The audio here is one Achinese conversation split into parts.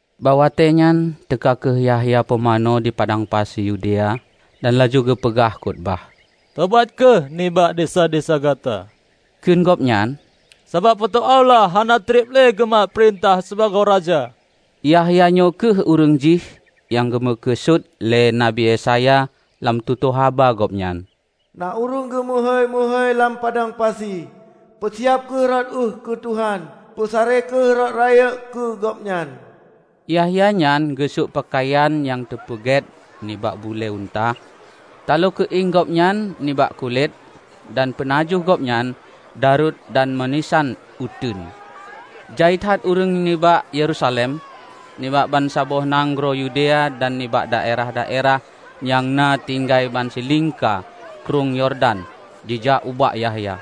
Bak watée nyan teuka kheueh Yahya Pumanö di padang pasi Yudea dan laju geupeuphon khutubah. "Tobat kheueh nibak desya-desya gata," kheun gobnyan, "Sabab Po teu Allah hana treub lé geumat peurintah sibagoe Raja!" Yahya nyoe kheueh ureuëng jih nyang geumeukeusut lé Nabi Yesaya lam tutoe haba gobnyan, "Na ureuëng geumeuhôi-meuhôi lam padang pasi, Peusiab kheueh rot ueh keu Tuhan; peusaré kheueh rot rayeuk keu Gobnyan.' " Yahya nyan geusök peukayan nyang teupeugét nibak bulée unta. Taloe keuieng gobnyan nibak kulét, dan peunajoh gobnyan daruet dan meulisan uteuen. Jai that ureuëng nibak Yerusalem, nibak bansaboh nanggroe Yudea dan nibak daerah-daerah nyang na tinggai bansilingka Krueng Yordan jijak ubak Yahya.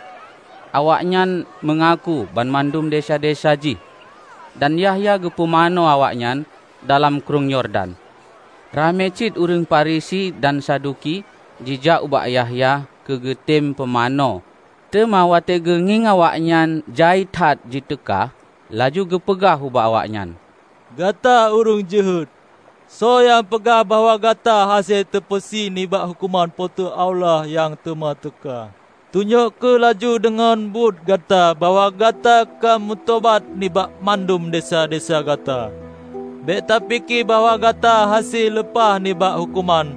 Awaknyan meungaku banmandum desya-desya jih, dan Yahya geupumanö awaknyan dalam Krueng Yordan. Ramé cit ureuëng Farisi dan Saduki jijak ubak Yahya keu geutem pumanö. Teuma watée geungieng awaknyan jai that jiteuka, laju geupeugah ubak awaknyan, "Gata ureuëng jeuhet! Soe nyang peugah bahwa gata hase teupeusie nibak huköman Po teu Allah nyang teuma teuka? Tunyok kheueh laju deungon buet gata bahwa gata ka meutobat nibak mandum desya-desya gata. Bék tapike bahwa gata hase leupah nibak huköman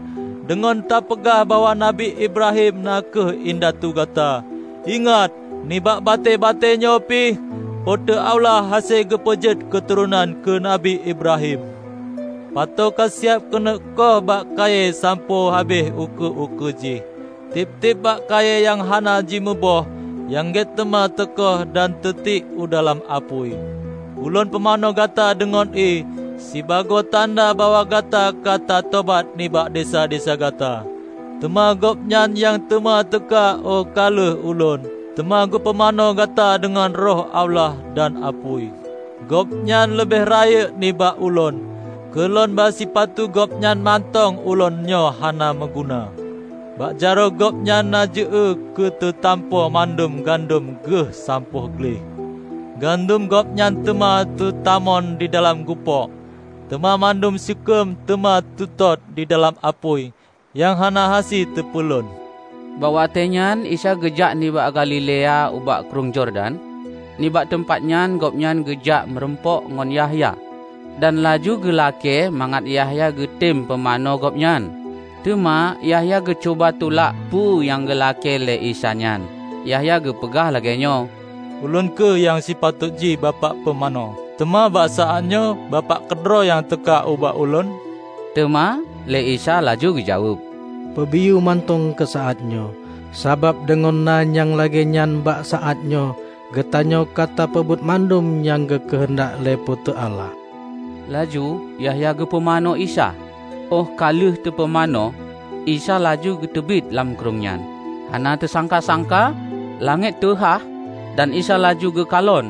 deungon tapeugah bahwa Nabi Ibrahim na kheueh indatu gata. Ingat, nibak batée-batée nyoe pih, Po teu Allah hase geupeujeuet keuturonan keu Nabi Ibrahim! Pato ka siab keuneuk koh bak kayée sampoe habéh ukeue-ukeue jih. Tieb-tieb bak kayée nyang hana jimuboh nyang gét teuma teukoh dan teutiek u dalam apui. Ulôn pumanö gata deungon ié sibagoe tanda bahwa gata ka tatobat nibak desya-desya gata; teuma Gobnyan nyang teuma teuka óh ka lheueh ulôn, teuma geupumanö gata deungon Roh Allah dan apui. Gobnyan leubeh rayeuk nibak ulôn. Keu lôn ba sipatu Gobnyan mantong ulôn nyoe hana meuguna. Bak jaroe Gobnyan na jeu-ée keu teutampo mandum gandom Geuh sampoe gleh. Gandom Gobnyan teuma teutamon didalam gupôk, teuma mandum seukeuem teuma teutot didalam apui nyang hana hase teupeulon." Bak watée nyan Isa geujak nibak Galilea ubak Krueng Yordan. Nibak teumpat nyan Gobnyan geujak meurumpok ngon Yahya dan laju geulakée mangat Yahya geutem pumanö Gobnyan. Teuma Yahya geucuba tulak peue nyang geulakée lé Isa nyan. Yahya geupeugah lagée nyoe, "Ulôn kheueh nyang sipatot jih Bapak pumanö. Teuma bak saát nyoe Bapak keudroe nyang teuka ubak ulôn." Teuma lé Isa laju geujaweueb, "Peubiyeu mantong keu saát nyoe. Sabab deungon na nyang lagée nyan bak saát nyoe geutanyoe ka tapeubuet bandum nyang geukeuheundak lé Po teu Allah." Laju Yahya geupumanö Isa. Óh ka lheueh teupumanö, Isa laju geuteubiet lam Krueng nyan. Hana teusangka-sangka langét teuhah dan Isa laju geukalon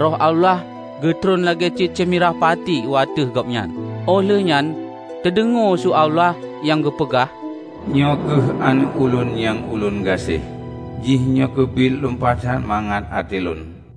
Roh Allah geutron lagée cicém mirah pati u ateueh Gobnyan. Óh lheueh nyan teudeungoe su Allah nyang geupeugah, "Nyoe kheueh Aneuëk Ulôn nyang Ulôn gaséh. Jihnyoe keubiet lumpah that mangat até Lôn."